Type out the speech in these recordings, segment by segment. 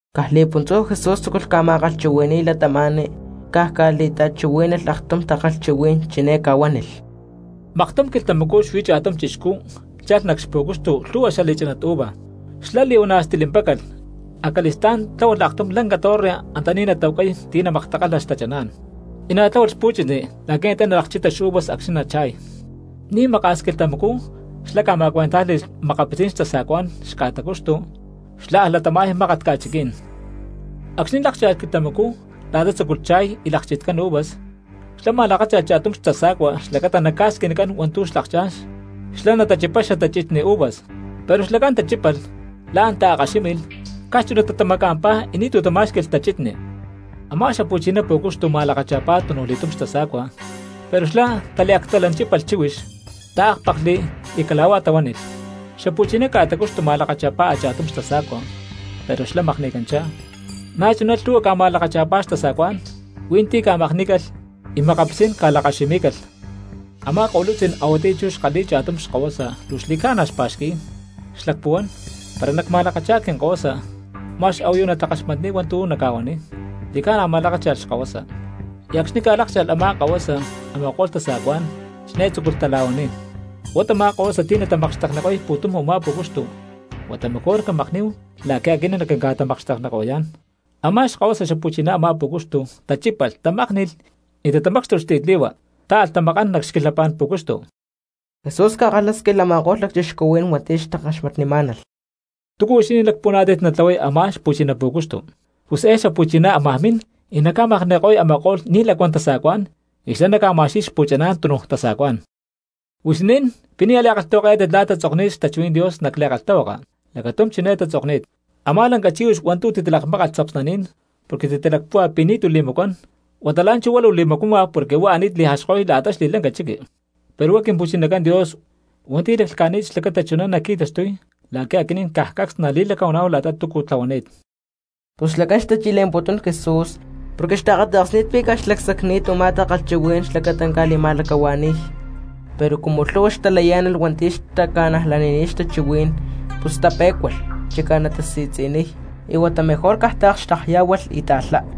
Caj li̠puntzú Jesús tzúculh ca̠ma̠kalhchuhui̠ni̠y cristianos, caj ca̠li̠ta̠chuhuí̠nalh aktum takalhchuhuí̠n, chiné ca̠huánilh: —Maktum quilhtamacú xuí cha̠tum chixcú chalh nac xpu̠cuxtu lhu̠hua xali̠chánat uva. Xlá li̠huana̠ stilimpácalh, acali̠stá̠n tláhualh aktum lanca torre antaní natahuacay ti̠ namaktakalha xtachaná̠n. Y na̠ tláhualh xpu̠chitni la̠qui̠ antá nalakchita xuvas acxni̠ nacha̠y. Ni̠ maka̠s quilhtamacú xlá ca̠ma̠cuentájli̠lh makapitzí̠n tasa̠cuá̠n xca̠tacuxtu, xlá alh latama̠y mákat ca̠chiquí̠n. Acxni̠ lákcha̠lh quilhtamacú la̠ta tzucuy cha̠y y lakchitcán uvas, xlá ma̠lakácha̠lh cha̠tum xtasa̠cua xlacata naca̠squinicán hua̠ntu̠ xlakchá̠n xlá nachipay xatachitni uvas. Pero xlacán tachípalh, la̠n taakkaxími̠lh, caj chunatá tamaca̠mpá y ni̠tu̠ tamá̠xqui̠lh tachitni. Amá xapu̠chiná pú̠cuxtu ma̠lakacha̠pá tunujli̠túm xtasa̠cua, pero xla̠ taliactalanchípalh chíhuix, taákpaklhli y cala̠huá tahuánilh. Xapuchiná ca̠tacuxtu ma̠lakacha̠pá a̠cha̠tum xtasa̠cua, pero xlá makni̠canchá. Na̠chuná lhu̠hua ca̠ma̠lakacha̠pá xtasa̠cuá̠n; hui̠ntí ca̠makní̠calh y makapitzí̠n ca̠lakkaximí̠calh. ’Amá ko̠lutzí̠n a̠huatiyá chú xkalhi̠y cha̠tum xkahuasa luu xli̠ca̠na xpa̠xqui̠y; xlacpuhuán: “Para nacma̠lakacha̠y quinkahuasa, ma̠x a̠huayu natakaxmatniy hua̠ntu̠ naca̠huaniy.” Xli̠ca̠na ma̠lakácha̠lh xkahuasa. Y acxni̠ ca̠lákcha̠lh a̠má kahuasa, a̠ma̠ko̠lh tasa̠cuá̠n chiné tzúculh tala̠huaniy: “Huá tamá kahuasa ti̠ natamakxtekniko̠y pu̠tum u̠má pú̠cuxtu, huata mejor camakní̠hu la̠qui̠ aquinín naquinca̠tamakxtekniko̠yá̠n.” Amá xkahuasa xapu̠chiná a̠má pú̠cuxtu tachípalh tamákni̠lh y tatamácxtulh xtiyatli̠hua, táalh tamakán nac xquilhapá̠n pú̠cuxtu. Jesús ca̠kalhásquilh a̠ma̠ko̠lh lacchixcuhuí̠n hua̠nti̠ xtakaxmatnimá̠nalh: —¿Túcu huixinín lacpuhuaná̠tit natlahuay a̠má xpu̠china pú̠cuxtu? Pus eé xapu̠chiná ámaj min y naca̠makni̠ko̠y a̠ma̠ko̠lh ni̠ lacuán tasa̠cuá̠n y xlá naca̠ma̠xqui̠y xpu̠chaná̠n tunuj tasa̠cuá̠n. ’Huixinín, ¿Pi̠ nia̠ li̠kalhtahuakayá̠tit la̠ tatzokni̠t xtachuhuí̠n Dios nac li̠kalhtahuaka? Lacatum chiné tatzokni̠t: Amá lanca chíhuix hua̠ntu̠ titalakmákalh tzapsnaní̠n porque titalacpúhua pi̠ ni̠tu̠ li̠macuán, huata la̠nchú huá luu li̠macuama porque huá ani̠t li̠jaxko̠y la̠ta xli̠lanca chiqui. Pero huá Quimpu̠chinacán Dios hua̠nti̠ laclhca̠ni̠t xlacata chuná naqui̠taxtuy la̠qui̠ aquinín caj cacs nali̠lacahuaná̠hu la̠ta túcu tlahuani̠t. Pus xlacán xtachi̠le̠mputún Jesús porque xtaakata̠ksni̠t pi̠ caj xlacsacni̠t u̠má takalhchuhuí̠n xlacata naca̠li̠ma̠lacahua̠ni̠y. Pero cumu lhu̠hua cristianos xtalayá̠nalh hua̠nti̠ xtaca̠najlanini̠t xtachuhuí̠n pus tapé̠cualh chicá natasi̠tzi̠niy, y huata mejor caj taakxtekyá̠hualh y taalhá.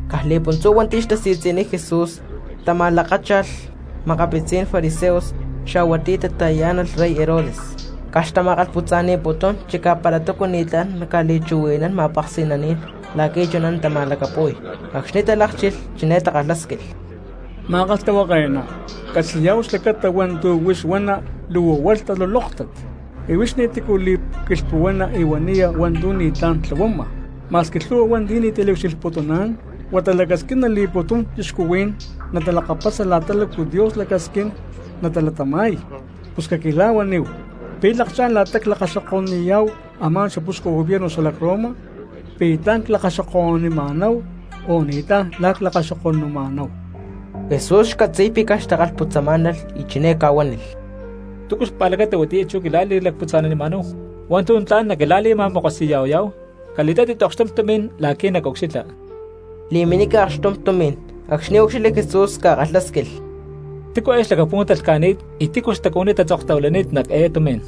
Caj li̠puntzú hua̠nti̠ xtasi̠tzi̠niy Jesús tama̠lakácha̠lh makapitzí̠n fariseos xa̠hua ti̠ xtata̠yá̠nalh rey Herodes, caj xtama̠kalhputza̠ni̠putún chicá para túcu ni̠tlá̠n naca̠li̠chuhui̠nán ma̠peksi̠naní̠n la̠qui̠ chuná natama̠lacapu̠y. Acxni̠ talákchilh chiné takalhásquilh: —Ma̠kalhtahuake̠ná, ccatzi̠yá̠hu xlacata hua̠ntu̠ huix huana luu huá talulóktat, y huix ni̠ti̠cu li̠quilhpuhuana y huaniya hua̠ntu̠ ni̠tlá̠n tlahuama, ma̠squi lhu̠hua hua̠nti̠ ni̠ taliucxilhputuná̠n, huata lacasquina xli̠pu̠tum cristianos natalakapasa la̠ta lácu Dios lacasquín natalatama̠y. Pus caquila̠huaníhu, ¿pi̠ lakchá̠n la̠ta clakaxoko̠nuniyá̠hu a̠má xapuxcu gobierno xalac Roma? ¿Pi̠ tla̠n clakaxoko̠nuniyá̠hu o ni̠tlá̠n la̠ clakaxoko̠numa̠náhu? Jesús xcatzi̠y pi̠ caj xtakalhputzamá̠nalh y chiné ca̠huánilh: —¿Túcu xpa̠lacata huatiyá chú quila̠lacputza̠nanimá̠hu hua̠ntu̠ tla̠n naquila̠li̠ma̠makosi̠ya̠huayá̠hu? Cali̠tátit okxtum tumi̠n la̠qui̠ nacucxilha. Li̠minica okxtum tumi̠n, acxni̠ úcxilhli Jesús ca̠kalhásquilh: —¿Tícu xlacapú̠n talhca̠ni̠t eé, y tícu xtacuhuiní tatzoktahuilani̠t nac eé tumi̠n?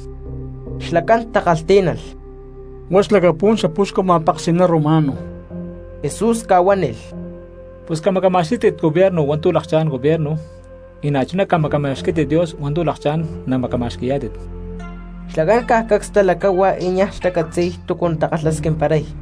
Xlacán takalhtí̠nalh: —Huá xlacapú̠n xapuxcu ma̠peksi̠ná romano. Jesús ca̠huánilh: —Pus camacama̠xquí̠tit gobierno hua̠ntu̠ lakchá̠n gobierno, y na̠chuná camacama̠xquí̠tit Dios hua̠ntu̠ lakchá̠n namacama̠xqui̠yá̠tit. Xlacán caj cacs talacáhua y niaj xtacatzi̠y túcu natakalhasquimparay.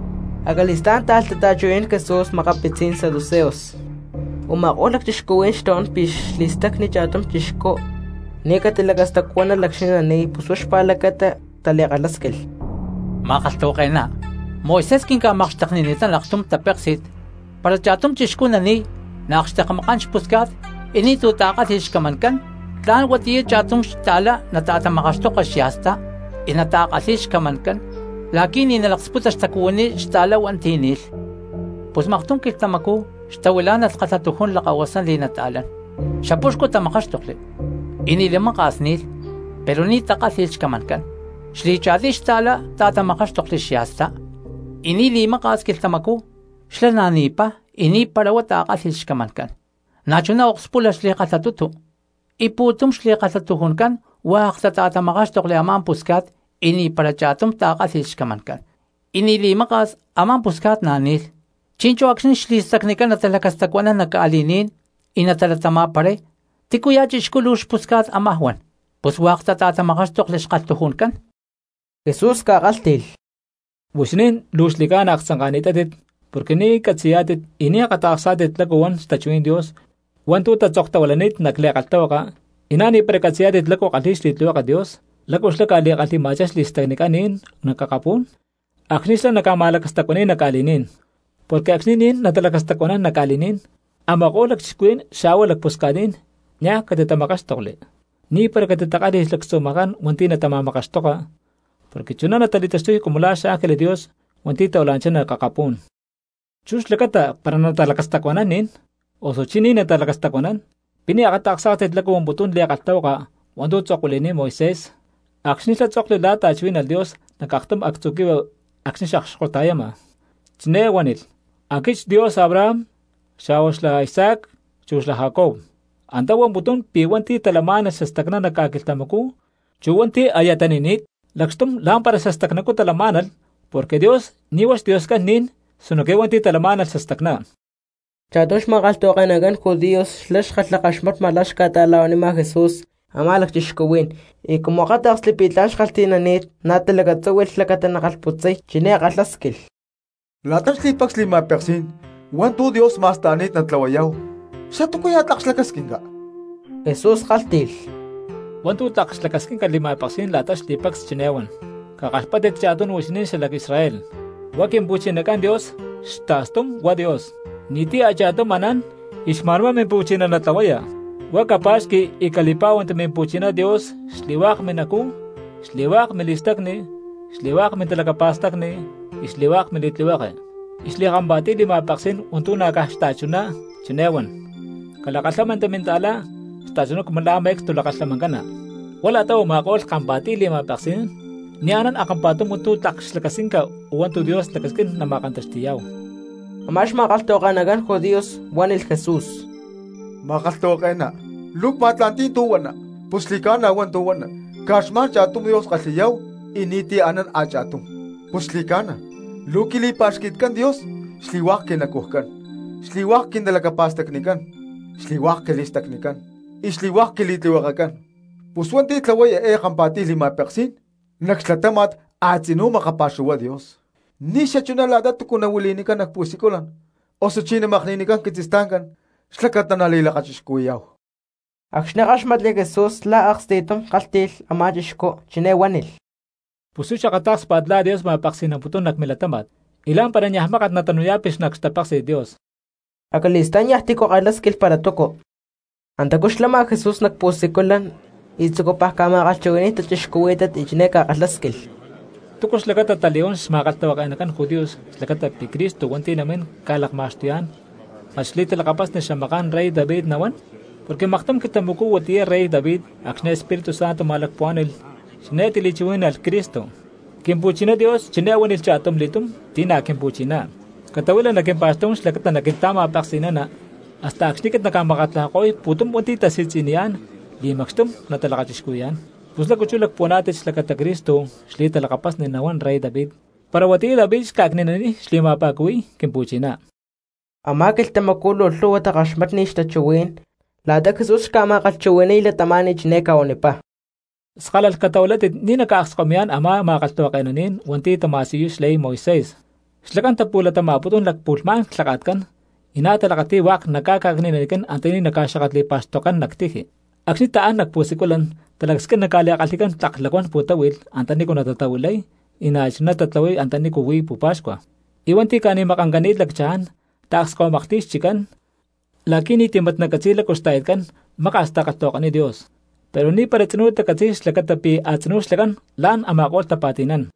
Acali̠stá̠n táalh tata̠chuhui̠nán Jesús makapitzí̠n saduceos. Uma̠kó̠lh cristianos xtahuán pi̠ xli̠stacni cha̠tum cristiano ni̠ catilacastacuánalh acxni̠ nani̠y, pus huá xpa̠lacata tali̠kalhásquilh: —Ma̠kalhtahuake̠ná, Moisés quinca̠makxteknini̠tán aktum tapéksi̠t, para cha̠tum chixcú nani̠y naakxtekmakán xpusca̠t y ni̠tu̠ ta̠kálhi̠lh xcamancán, tla̠n huatiyá cha̠tum xta̠lá nata̠tamakaxtoka xya̠stá y nata̠kalhi̠y xcamancán la̠qui̠ ni̠ nalaksputa xtacuhuiní xta̠lá hua̠nti̠ ni̠lh. Pus maktum quilhtamacú xtahuilá̠nalh kalhatujún lakahuasán li̠nata̠lán, xapuxcu tamakáxtokli, y ni̠ li̠maka̠s ni̠lh pero ni̠ takálhi̠lh xcamancán. Xli̠cha̠tiy xta̠lá ta̠tamakáxtokli xya̠stá, y ni̠ li̠maka̠s quilhtamacú xlá na̠ ni̠pá y ni̠para huá ta̠kálhi̠lh xcamancán. Na̠ chuná okspúlalh xli̠kalhatutu. Y pu̠tum xli̠kalhatujuncán hua̠k tata̠tamakáxtokli a̠má pusca̠t, y ni̠para cha̠tum ta̠kálhi̠lh xcamancán. Y ni̠ li̠maka̠s a̠má pusca̠t na̠ ni̠lh. Chi̠nchú acxni̠ xli̠stacnicán natalacastacuanán nac ca̠li̠ní̠n y natalatama̠paray, ¿tícuya̠ chixcú luu xpusca̠t ámaj huán, pus hua̠k tata̠tamakáxtokli xkalhatujuncán? Jesús ca̠kálhti̠lh: —Huixinín luu xli̠ca̠na aktzanka̠ni̠tátit porque ni̠ catzi̠yá̠tit y ni̠ akata̠ksá̠tit lácu huan xtachuhuí̠n Dios hua̠ntu̠ tatzoktahuilani̠t nac li̠kalhtahuaka, y na̠ ni̠para catzi̠yá̠tit lácu kalhi̠y xli̠tlihueke Dios, lácu xlá ca̠li̠kalhi̠ma̠chá xli̠stacnicán ní̠n nac akapú̠n acxni̠ xlá naca̠ma̠lacastacuani̠y nac ca̠li̠ní̠n. Porque acxni̠ ni̠n natalacastacuanán nac ca̠li̠ní̠n a̠ma̠ko̠lh lacchixcuhuí̠n xa̠hua lacpusca̠tní̠n niaj ti̠ catitamakáxtokli, ni̠para catitakálhi̠lh xlactzumajancán hua̠nti̠ natama̠makaxtoka, porque chuná natali̠taxtuy cumu la̠ xángeles Dios hua̠nti̠ tahuila̠nanchá nac akapú̠n. Chú xlacata para natalacastacuanán ni̠n, osuchí ni̠ natalacastacuanán, ¿pi̠ ni̠ akata̠ksá̠tit lácu huamputún li̠kalhtahuaka hua̠ntu̠ tzokli Moisés acxni̠ xlá tzokli la̠ ta̠chuhuí̠nalh Dios nac akatum actzu̠ quihui acxni̠ xakxkota̠yama? Chiné huánilh: “Aquit xDios Abraham xa̠hua xlá Isaac chu xlá Jacob.” Antá huamputún pi̠ hua̠nti̠ talamá̠nalh xastacná nac ca̠quilhtamacú chu hua̠nti̠ aya tani̠ni̠t lacxtum lá̠mpara xastacnacú talamá̠nalh, porque Dios ni̠ huá xDioscán ni̠n sinoque hua̠nti̠ talamá̠nalh xastacná. Cha̠tum xma̠kalhtahuake̠nacán judíos xlá xkalhakaxmatma la̠ xca̠ta̠la̠huanima Jesús a̠má lacchixcuhuí̠n, y cumu akáta̠ksli pi̠ tla̠n xkalhti̠nani̠t, na̠ talacatzúhui̠lh xlacata nakalhputzay, chiné kalhásquilh: —La̠ta xli̠pacs li̠ma̠peksí̠n hua̠ntu̠ Dios ma̠sta̠ni̠t natlahuayá̠hu, ¿xatúcuya̠ tlak xlacasquinca? Jesús kálhti̠lh: —Hua̠ntu̠ tlak xlacasquinca li̠ma̠peksí̠n la̠ta xli̠pacs chiné huan: “Cakaxpáttit cha̠tunu huixinín xalac Israel, huá Quimpu̠chinacán Dios xta̠stum huá Dios, ni̠ti̠ a̠cha̠tum anán, y xma̠nhuá Mimpu̠chiná natlahuaya. Huá capa̠xqui y cali̠pá̠huanti Mimpu̠chiná Dios xli̠hua̠k minacú, xli̠hua̠k mili̠stacni, xli̠hua̠k mintalacapa̠stacni y xli̠hua̠k mili̠tlihueke.” Y xli̠kampa̠tiy li̠ma̠peksí̠n hua̠ntu̠ na̠ caj xta̠chuná, chiné huan: “Calakalhámanti minta̠cristiano xta̠chuná cumu la̠ me̠cstu lakalhamancana.” Huá la̠ta u̠ma̠ko̠lh kampa̠tiy li̠ma̠peksí̠n ni̠ anán a̠kampa̠tum hua̠ntu̠ tlak xlacasquinca o hua̠ntu̠ Dios lacasquín nama̠kantaxti̠yá̠hu. Amá xma̠kalhtahuake̠nacán judíos huánilh Jesús: —Ma̠kalhtahuake̠ná, luu cma̠tla̠nti̠y tu̠ huana, pus xli̠ca̠na hua̠ntu̠ huana, caj xma̠n cha̠tum Dios kalhi̠yá̠hu y ni̠ti̠ anán a̠cha̠tum. Pus xli̠cána luu quili̠pa̠xqui̠tcán Dios xli̠hua̠k quinacujcán, xli̠hua̠k quintalacapa̠stacnicán, xli̠hua̠k quili̠stacnicán y xli̠hua̠k quili̠tlihuekecán. Pus hua̠nti̠ tlahuay eé kampa̠tiy li̠ma̠peksí̠n nac xlatáma̠t a̠tzinú makapa̠xuhuay Dios ni̠xachuná la̠ta túcu nahuili̠nicán nac pu̠siculan, osuchí namakni̠nicán quitzistancá̠n xlacata nali̠lakachixcuhui̠yá̠hu. Acxni̠ káxmatli Jesús la̠ aksti̠tum kálhti̠lh a̠má chixcú, chiné huánilh: —Pus huix akatá̠kspa̠t la̠ Dios ma̠peksi̠namputún nac milatáma̠t, y la̠mpara niaj mákat natanu̠ya̠pi nac xtapéksi̠t Dios. Acali̠stá̠n niaj tícu kalhásquilh para túcu. Antacú xlama Jesús nac pu̠siculan y tzucupaj ca̠ma̠kalhchuhui̠ni̠y cristianos, chiné ca̠kalhásquilh: —¿Túcu xlacata tali̠huán xma̠kalhtahuake̠nacán judíos xlacata pi̠ Cristo hua̠nti̠ namín ca̠lakma̠xtuyá̠n mat xli̠talakapasni xamaká̠n rey David nahuán? Porque maktum quilhtamacú huatiyá rey David acxni̠ Espíritu Santo ma̠lacpuhuá̠ni̠lh chiné tili̠chuhuí̠nalh Cristo: Quimpu̠chiná Dios chiné huánilh cha̠tum li̠túm ti̠ na̠ Quimpu̠chiná: “Catahuila nac quimpa̠xtú̠n xlacata naquinta̠ma̠peksi̠nana, hasta acxni̠ aquit nacca̠makatlajako̠y pu̠tum hua̠nti̠ tasi̠tzi̠niyá̠n li̠macxtum natalakachixcuhui̠yá̠n.” Pus, ¿lácu chú lacpuhuaná̠tit xlacata Cristo xli̠talakapasni nahuán rey David para huatiyá David xca̠cni̠naniy xli̠ma̠pa̠cuhui̠y, Quimpu̠china? Amá quilhtamacú luu lhu̠hua xtakaxmatniy xtachuhuí̠n. La̠ta Jesús xca̠ma̠kalhchuhui̠ni̠y cristianos chiné ca̠huanipá: —Skálalh catahuilátit ni̠ naca̠akskahuimi̠yá̠n a̠má mima̠kalhtahuake̠nacán hua̠nti̠ tama̠siyuy xley Moisés. Xlacán tapu̠latama̠putún lacpu̠lhmá̠n clhaka̠tcán y na̠ talakati̠y hua̠k naca̠cni̠nanicán antaní naca̠xakatli̠pa̠xtokcán nac tiji. Acxni̠ taán nac pu̠siculan talacasquín naca̠li̠kalhi̠cán tlak lacuán pu̠táhui̠lh antanícu natatahuilay, y na̠chuná tatlahuay antanícu huí pu̠pa̠xcua. Y hua̠nti̠ ca̠ni̠makancani̠t lacchaján taakskahuimaklhti̠y xchiccán, la̠qui̠ ni̠ti̠ mat nacatzi̠y lácu xta̠yatcán maka̠s takalhtahuakaniy Dios. Pero ni̠para tzinú tacatzi̠y xlacata pi̠ a̠tzinú xlacán la̠n a̠ma̠ko̠lh tapa̠ti̠nán.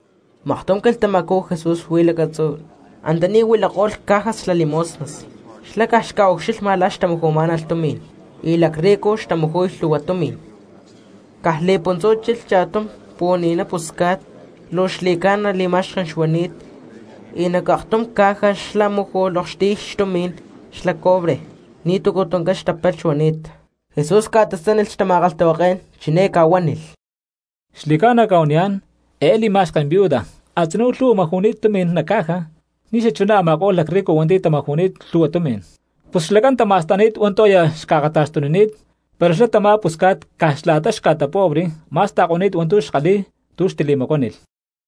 Maktum quilhtamacú Jesús xuí lacatzú antaní huilako̠lh cajas xla limosnas, xlá caj xca̠ucxilhma cristianos la̠ xtamaju̠má̠nalh tumi̠n; y lacrrico xtamaju̠y lhu̠hua tumi̠n. Caj li̠puntzú chilh cha̠tum pu̠ni̠na pusca̠t luu xli̠ca̠na li̠ma̠xken xuani̠t, y nac aktum caja xlá máju̠lh okxtiy tumi̠n xla cobre nitúcu tuncán xtapalh xuani̠t. Jesús ca̠tasánilh xtama̠kalhtahuaké̠n, chiné ca̠huánilh: —Xli̠ca̠na cca̠huaniyá̠n, eé li̠ma̠xken viuda a̠tzinú lhu̠hua maju̠ni̠t tumi̠n nac caja ni̠xachuná a̠ma̠ko̠lh lacrrico hua̠nti̠ tamaju̠ko̠ni̠t lhu̠hua tumi̠n. Pus xlacán tama̠sta̠ni̠t hua̠ntu̠ aya xca̠akata̠xtunini̠t, pero xlá tamá pusca̠t caj la̠ta xca̠tapobre ma̠sta̠ko̠ni̠t hua̠ntu̠ xkalhi̠y tu̠ xtili̠macuánilh.